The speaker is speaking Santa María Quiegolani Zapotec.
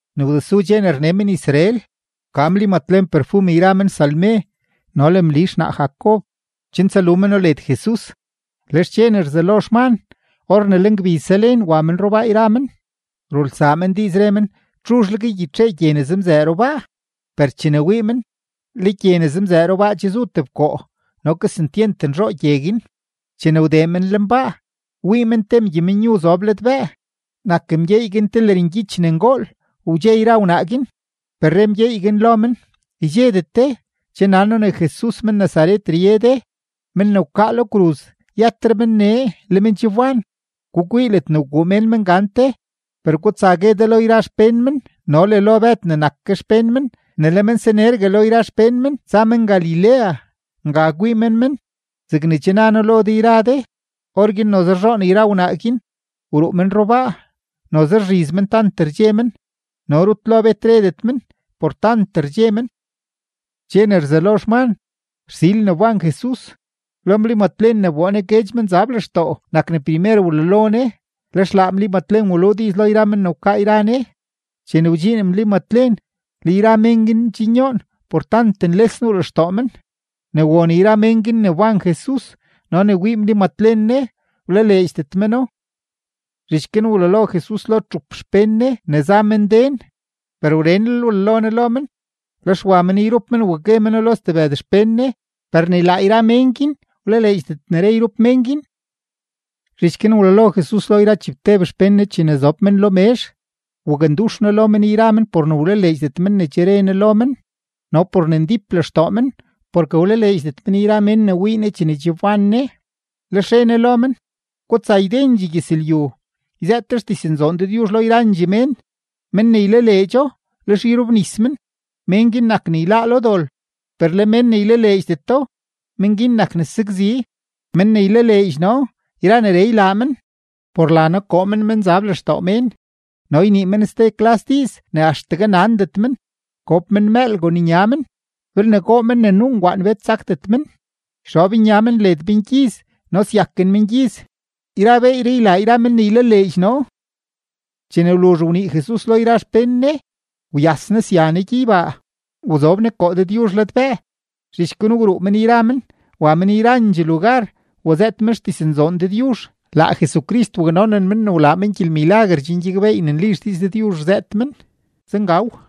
Ne wdesu dxe ne rne men-Israel, wka Mli Matlen perfum yra men Salme no le Mli xnaa Jacob, chen tsalu meno led Jesus. Lex dxe ne rzelo xman, or ne le ngbiz zalen, wa men rubaa yra men. Rulsaa men diiz, re men: ―¿Txuzhleg ygyitxee gye ne zemzëë rubaa? Per chene wii men, le gye ne zemzëë rubaa che zu tebkoo, no kesentyent nzhoo gye guin. Chene wdee men lenbaa, wii men te mgyeymenyu zob ladbëë. Nak mgyeey guin te lërngyich ne ngool. Wdxe yra wnaa guin. Per re mgyeey guin lo men: ―Ydxedet de. Che nan noo ne Jesus men-Nazaret rye de, men ne wkaa lo kruz. Yëtre men nee; le men che wban. Gukwii ledne wguu mén men gante. Per gutsa gue de lo yra xpén men no le lo Bëd ne nak ke xpén men ne le men sanergue lo yra xpén men tsa men Galilea; nga kwii men men zegne che na men lo de yra de. Orguin noze rzhoon yra wnaa guin, wruu men rubaa. Noze rzhiz men, tant rdxe men. No rut lo bet redet men, por tant rdxe men. Dxe ne rzelo xman, rsil ne wban Jesus, lo Mli Matlen ne wboo Ne guedx menzab lextoo nak ne primer wlalo Ne. Lex laa Mli Matlen waluu diiz lo yra men ne wkaa yra Ne. Chene wdxiin Mli Matlen, le yra mén guin ndxinyoon por tant nles nuu lextoo men. Ne won yra men guin ne mbán Jesus no ne wii Mli Matlen Ne, wlaleedxdet meno. Zhich guin wlalo Jesus lo txup xpén Ne ne za men den, per wrenlel wlalo Ne lo men. Lex wa men yrup men wa gue meno lo stebëd xpén Ne, per ni laa yra men guin wlaleedxdet ne re yrup men guin. Zhich guin wlalo Jesus lo yra chibteb xpén Ne chene zob men lo mezh; wakndux Ne lo men yra men por ne wlaleedxdet men ne che re Ne lo men no por ne ndíp lextoo men porke wlaleedxdet men yra mén ne wii Ne chene che wban Ne. Lex re Ne lo men: ―Gutsa ydendxee gyëzlyu, yzëët de xdiznzoon Dëdyuzh lo yrandxee mén. Men ne ylaleedxo, lex yrobnis men, men guin nak ne yláá lo dol; per le men ne ylaleedxdeto, men guin nak ne sakzi. Men ne ylaleedx noo yra neree ylaa men: Por la noo koo men menzab lextoo mén; no ynii men ste klas diiz ne axtegue nandet men; gob men mëël kon nya men; belne goo men ne nuu ngwaan, bet sakdet men; yxob nya men led mengyiz, no syaken mengyiz. Yra beeyree ylaa yra men ne ylaleedx noo. Chene wluzh wnii Jesus lo yra xpén Ne, wyas Ne sya Ne gyeybaa, wzob Ne koo Dëdyuzh ladbëë. Zhich guin wruu men yra men, wa men yrandxee lugar, wazëët men xdiznzoon Dëdyuzh. Laa Jesucrist waknonen men ne wlaa men gyelmilaguer chen gyakbeey ne nli xdiiz Dëdyuzh rzëët men. Zengaw.